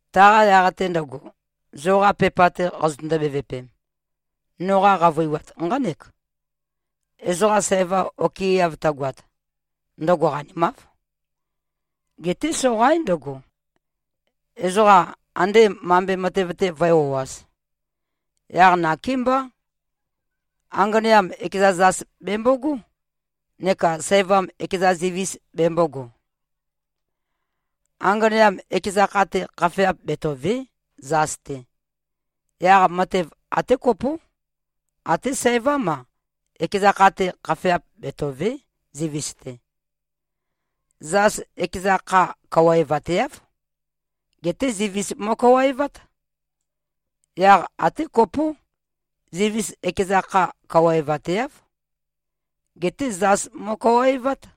Taqa yaq-te ndøgo, zoqa pepa-te qazøtøndo-bevøpem, noqa qavøiwat nqánek: Ezoqa sæva okɨeav tøgoat, ndøgo qanimáv. Geté soqaín ndøgo, ezoqa andé mambe matev-te vǿe-o꞉āz. Yaq nakémbá, anganeam, ekeza zas bèmbogó, neka sævam ekeza zivis bembōgo. Anganeam ekeza kha-te khafeap betòve᷄, zas-te. Yaq matev até kopó. Até sævám-a, ekeza kha-te khafeap betòve᷄, zivis-te. Zas ekeza kha kawaevateáv. Geté zivis mo꞉kawaevát. Yaq até kopó, zivis ekeza kha kawaevateáv. Geté zas mo꞉kawaevát.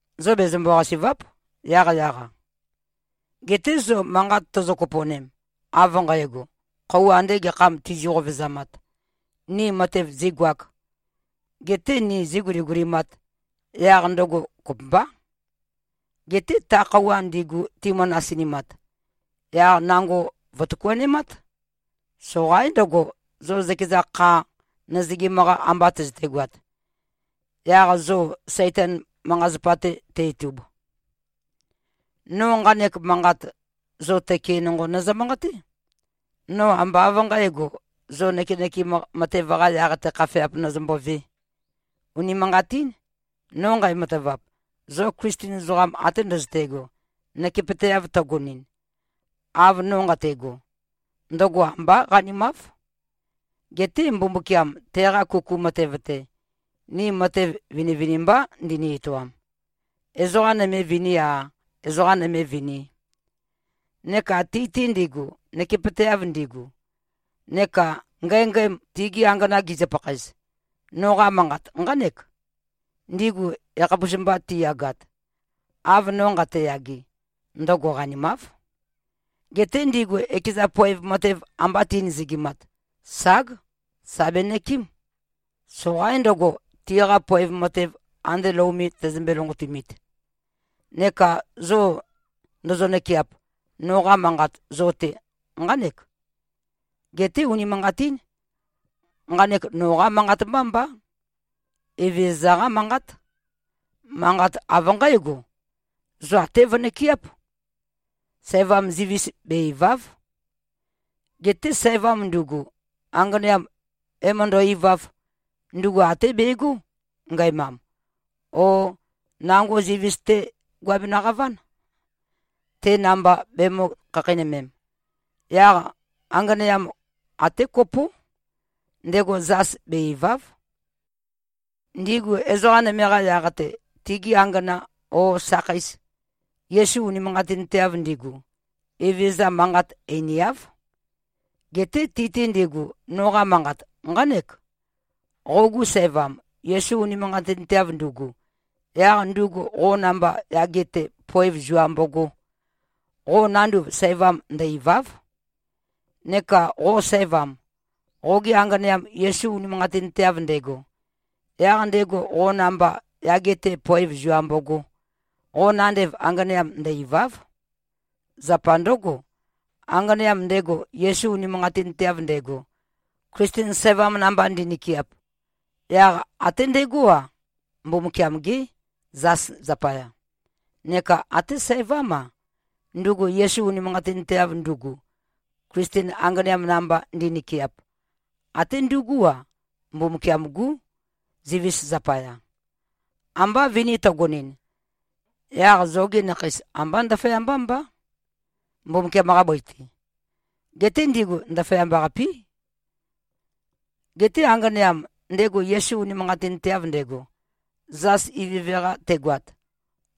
Zo bezømbo-qasì꞉va᷄p, yaqyaq-a. Geté zo manqat tozo-kopo꞉nem, av nqægo, khøuwa ande gekham tizi-qovezamat, ni matev zīgoāk, getē ni zīguligulimāt, yaq ndøgo kopømbá. Geté ta khøuwa ndigu timø-nasinimat, yaq nango vø̀tøkuanemát. Soqaín ndøgo, zo zøkeza kha nøzøgim-qa amba tøzøtegoat, yaq zo Saitan manqa-zapa-te te-itub. No nqanek manqat, zo tøke nonqo nøzø-manqaté. No ambá av nqǣgo, zo nøkenøkem matev-qa yaq-te khafeap nozømbovē. Unimanqatín. No nqæmatavap, zo Klisten ezoqam ate ndøzøte꞉go, nøkepøteav tøgonɨn, av no nqate꞉go, ndøgo ambá qanimáv. Geté Mbumbukiam, teqa kuku matev-te, ni matev vinivinimbá ndini-etoam. Ezoqa nøme viní-a, ezoqa nøme vini. Neka ti-te ndigu, nøkepøteav ndigu, neka ngængæm, tigi angana gizø-pakhaez, noqa manqat nqánek: Ndigu yakhapus-mba tiyagat, av no nqateyage, ndøgo qanimáv. Geté ndigu ekeza poev matev amba ti꞉nøzøgimat, ság, sà benøkɨ́m. Soqaín ndøgo, tiqa poev matev ande lou me tøzømbe-lonqotumit. Neka zo ndozo-nøkɨap, noqa manqat zo-te nqánek. Geté unimanqatín. Nqanek noqá manqat mbá mbá. Evezøza-qá manqát. Manqat av nqǽgo: Zo até vønøkɨáp. Sævam zivis be-ìva᷄v. Geté sævam ndugu, anganeam ē-møndø-ivāv, ndugu até begó, ngæmam, o nango zivis-té guabenø-qaván, te namba bemø̄-khakheinømem. Yaq anganeam, até kopó, ndego zas be-ìva᷄v. Ndigu ezoqa nøme-qa yaq-te, tigi angana o sakheis, Yesu unimanqatinteav ndigu, Evezøza manqat einiáv. Geté ti-te ndigu, noqa manqat nqánek: Qogu sævam, Yesu unimanqatinteav ndugu, yaq ndugu qo namba yage-te poev zua mbogō, qo nanduv sævam ndø-ìva᷄v. Neka qo sævam, qoge anganeam Yesu unimanqatinteav ndego, yaq ndego qo namba yage-te poev zua mbogō, qo nandev anganeam ndø-ìva᷄v. Zapa ndǿgo, anganeam ndego Yesu unimanqatinteav ndego, Klisten sævam namba ndi꞉nøkeap, yaq até ndegó-a, Mbumbukiam-gé, zas zapaya. Neka até sævám-a, ndugu Yesu unimanqatinteav ndugu, Klisten anganeam namba ndi꞉nøkeap, até ndugú-a, Mbumbukiam-gú, zivis zapaya. Amba vini tøgonɨn, yaq zogi nakheis ambá ndaføyambá mbá, Mbumbukiam-qa bøi-te. Geté ndigu ndaføyamba-qapí. Geté anganeam, ndego Yesu unimanqatinteav ndego, zas ivøve-qa tegoat,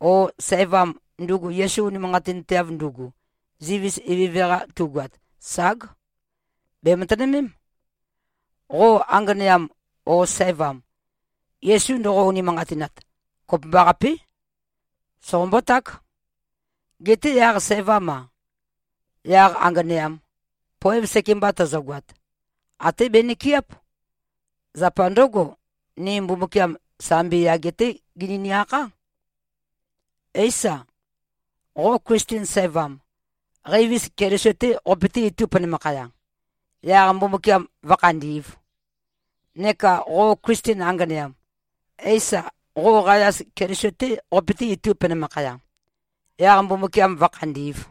o sævam, ndugu Yesu unimanqatinteav ndugu, zivis ivøve-qa tugoat, ság, bèmatønømém. Qo anganeam o sævam, Yesu ndoqo-unimanqatinat, kopømbaqapé, soqombó-ták. Geté yaq sævam-a, yaq anganeam, poev sekemba tøzøgoat, até benøkɨáp. Zapa ndǿgo, ni Mbumbukiam, sambi yage-té genøni-akhá. Éisa, qo Klisten sævam, qeivis Keliso-té qopøté-itū penømakhaya, yaq Mbumbukiam vǿkhandī꞉v? Neka qo Klisten anganeam. Éisa, qo qayas Keliso-té qopøté-itū penømakhaya, yaq Mbumbukiam vǿkhandī꞉v?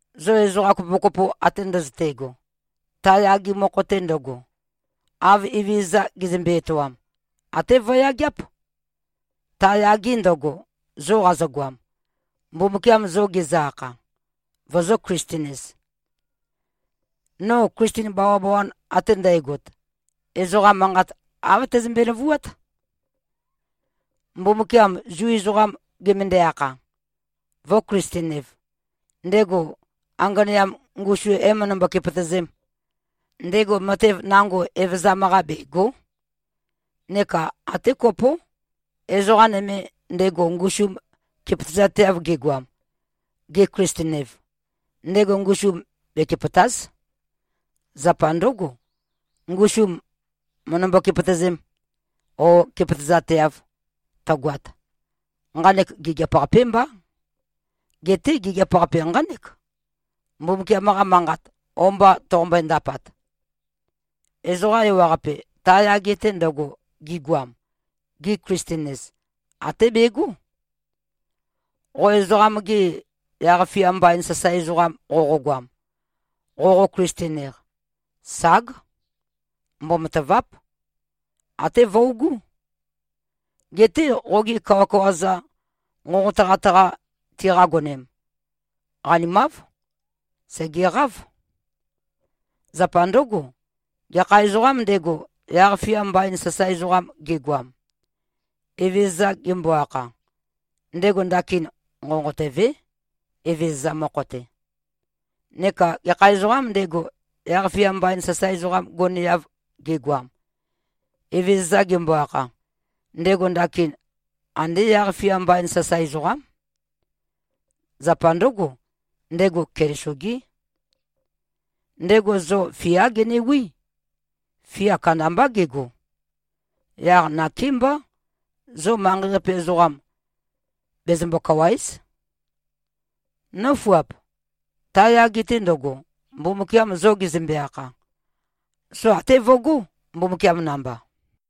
Zo ezoqa kopokopo ate ndøzøte꞉go, ta yage mokho-te ndøgo, av Evezøza gezømbe-etoam, até vøyageáp, ta yage ndøgo, zo qazogoam, Mbumbukiam zo gezø-akha, vozō-Klisten-ez. No Klisten bawabawan ate ndægot, ezoqa manqat āv tæzømbe-løvuát. Mbumbukiam Zu ezoqam gemøndæ-akha, vø̄-Klisten-ev, ndego anganeam ngusum ē-møndømbo-kepøtøzēm, ndego matev nango evøzam-qa bègo᷄. Neka até kopó, ezoqa nøme, ndego ngusum kepøtøzateav gegoam, ge-Klisten-ev, ndego ngusum bekepø̀ta᷄z. Zapa ndǿgo, ngusum mø̀ndømbo-kepøtøzēm, ō, kepøtøzateav tøgoat, nqanek gigiap-qapé mbá. Geté gigiap-qape nqánek, Mbumbukiam-qa manqat o-mba toqombøe-ndapat. Ezoqa ewaqape, ta yage-te ndøgo, gigoam, gi-Klisten-ez, até begó. Qo ezoqam-ge yaq-fia mbain sasae ezoqam qoqogoam, qoqo-Klisten-eq, ság. Mbomatàva᷄p. Até vøugú. Geté qogi kawakawa-za nqonqotøqat-qa tiqagonem, qanimáv. Sègeqáv. Zapa ndǿgo, gekha ezoqām ndego, yaq-fia mbain sasae ezoqam gegoam, Evezøza gembo-akha, ndego ndakin nqonqotøvé, Evezøza mokho-te. Neka gekha ezoqām ndego, yaq-fia mbain sasae ezoqam goneav gegoam, Evezøza gembo-akha, ndego ndakin andé yaq-fia mbain sasae ezoqám. Zapa ndǿgo, ndego Keliso-gé. Ndego zo fiá genewí. Fia kandambá gego. Yaq nakémbá, zo manqei-qape ezoqa bezømbo-kawàe᷄z. Nǿfuap! Ta yage-te ndøgo, Mbumbukiam zo gezømbe-akha, zo até vøgó, Mbumbukiam namba.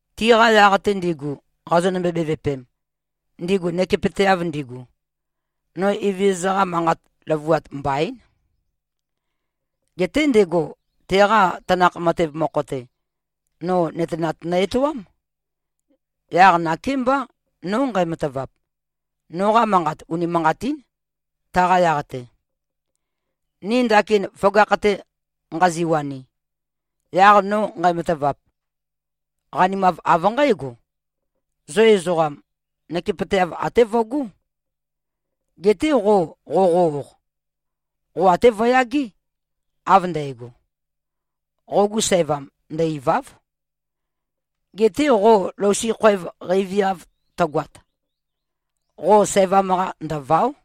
Tiqa yaq-te ndigu, qazonø-bevøpem, ndigu nøkepøteav ndigu, no Evezøza-qa manqa løvuat mbaín. Geté ndego, teqa tanakh matev mokho-te, no nøtenat nø-etoám. Yaq nakémbá, no nqæmatavap, noqa manqat unimanqatín, taqa yaq-te. Ni ndakin føgakh-te nqaziwani, yaq no nqæmatavap, qanimav av nqǽgo: Zo ezoqam, nøkepøteav até vøgó. Geté qo qoqo-oq, qo até vøyagé, av ndægo. Qogu sævam, ndø-ìva᷄v. Geté qo lousi khoev qeiviav tøgoat, qo sævam-qa ndø̀vao᷄.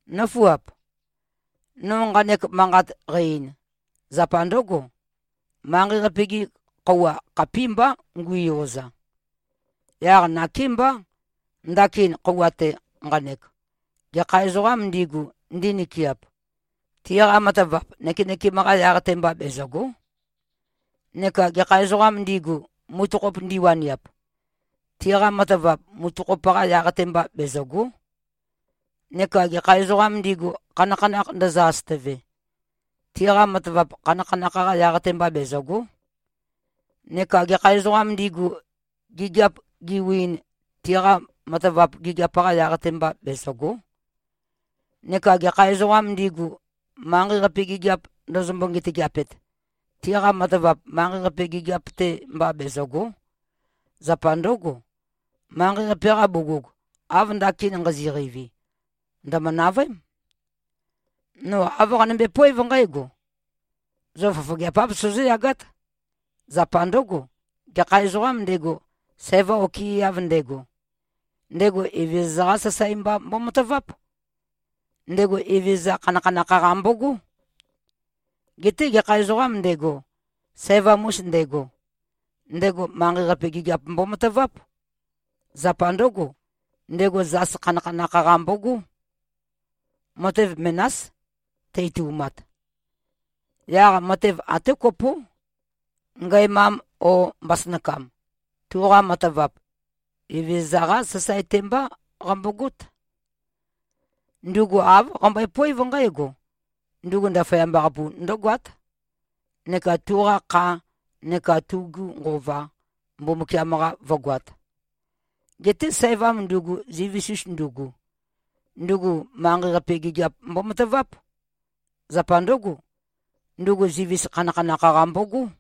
Nǿfuap! No nqanek manqat qæ-ein, zapa ndǿgo: Manqei-qape-gi khøuwa khapímbá ngu꞉yoza. Yaq nakémbá, ndakin khøuwa-te nqanek, gekha ezoqām ndigu, ndinøkɨap, tiqa matavap nøkenøkem-qa yaq-te mba bezø̀go᷄. Neka gekha ezoqām ndigu, mutøkhop ndiwaniap, tiqa matavap mutøkhop-qa yaq-te mba, bezø̀go᷄. Neka gekha ezoqām ndigu, khanakhanakh ndøzø-asøtøve, tiqa matavap khanakhanakh-qa yaq-te mba bezø̀go᷄. Neka gekha ezoqām ndigu, gigiap giwiin, tiqa matavap gigiap-qa yaq-te mba, bezø̀go᷄. Neka gekha ezoqām ndigu, manqei-qape gigiap ndøzømbo-ngetageapet, tiqa matavap manqei-qape gigiap-te mba bezø̀go᷄. Zapa ndǿgo, manqei-qape-qa bugug, av ndakin nqazi꞉-qeivi, ndø̀mø-navøém. No āv qanømbe-poév nqǽgo: Zo fofogeap-áv, sozóyagát. Zapa ndǿgo, gekha ezoqām ndego, sæva okɨeav ndego, ndego Evezøza-qá sasae mba mbomataváp. Ndego Evezøza khanakhanakh-qa mbogó. Geté gekha ezoqām ndego, sævam-us ndego, ndego manqei-qape gigiap mbomataváp. Zapa ndǿgo, ndego zas khanakhanakh-qa mbogó. Matev menás tø-itu꞉mat. Yaq matev até kopó, ngæmam o mbasønakam, tuqa matavap, Evezøza-qá sasae-te mbá qambogót. Ndugu āv qambøepoév nqǽgo: Ndugu ndaføyamba-qapu ndǿgoát, neka tuqa kha neka tugu nqova, Mbumbukiam-qa vǿgoāt. Geté sævam ndugu, zivis-us ndugu, ndugu manqei-qape gigiap mbomataváp. Zapa ndǿgo, ndugu zivis khanakhanakh-qa mbogó.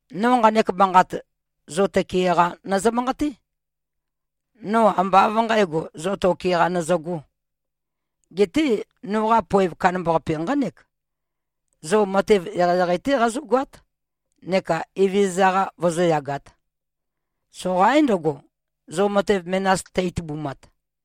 No nqanek manqat, zo tøke-qa nøzø-manqaté. No ambá av nqǣgo, zo toke-qa nøzøgō. Geté noqa poev kandambaqape nqánek: Zo matev eqeieqei-té qazógoát neka Evezøza-qa vozóyagāt. Soqaín ndøgo, zo matev menas tø-itubumat.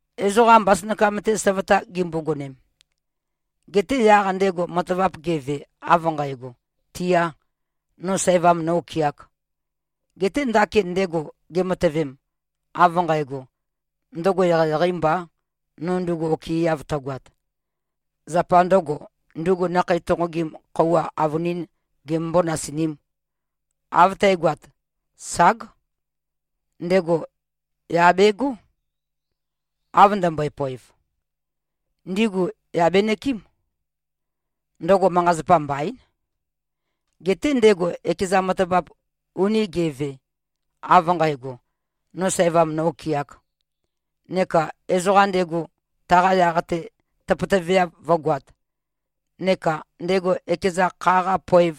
Ezoqam mbasønakam-te søvøta gimbogonem, geté yaq ndego matavap geve, av nqægo, tiā, no sæva nō-okɨāk, geté ndakin ndego gematøvem, av nqægo, ndøgo eqeieqeī mbā, no ndugu okɨeav tøgoat, zapa ndø̄go, ndugu nakhei tonqogim khøuwa avønīn gemømbō-nasinīm, av tægoat, ság, ndego yà begó, av ndømbøe-poev. Ndigu yà benøkɨ́m. Ndøgo manqa-zapa mbaín. Geté ndego ekeza matavap uni ge꞉ve, av nqægo, no sæva nō-okɨāk, neka ezoqa ndego taqa yaq-te tøpøtøveav vǿgoāt, neka ndego ekeza kha-qa poev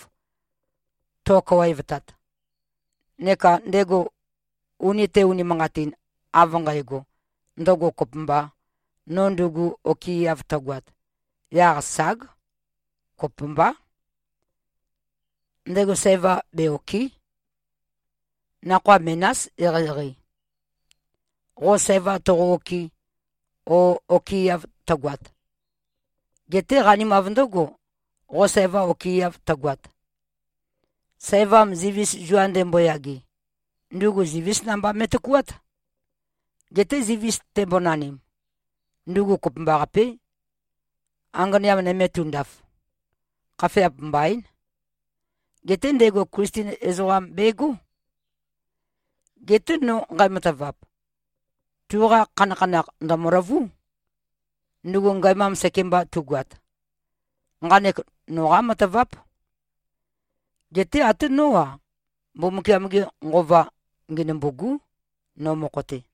to꞉kawaevtat, neka ndego uni te꞉-unimanqatin av nqægo, ndøgo kopømbā, no ndugu okɨeav tøgoat, yaq ság. Kopømbá. Ndego sæva be-òkɨ᷄. Nakhoa menás eqeieqei, qo sæva toqo-òkɨ̄, o, okɨeav tøgoat. Geté qanimav ndǿgo, qo sæva okɨeav tøgoat. Sævam zivis zua ndemboyage, ndugu zivís namba me꞉tøkuát. Geté zivis tembonanim, ndugu kopømbaqapé, anganeam nøme tundaf. Khafeap mbaín. Geté ndego Klisten ezoqam begó. Geté no nqæmatavap, tuqa khanakhanakh ndø̀møløvú, ndugu ngæmam sekemba tugoat. Nqanek noqá mataváp. Geté até nó-a, Mbumbukiam-ge Nqova ngenømbû꞉gú, no mokho-te.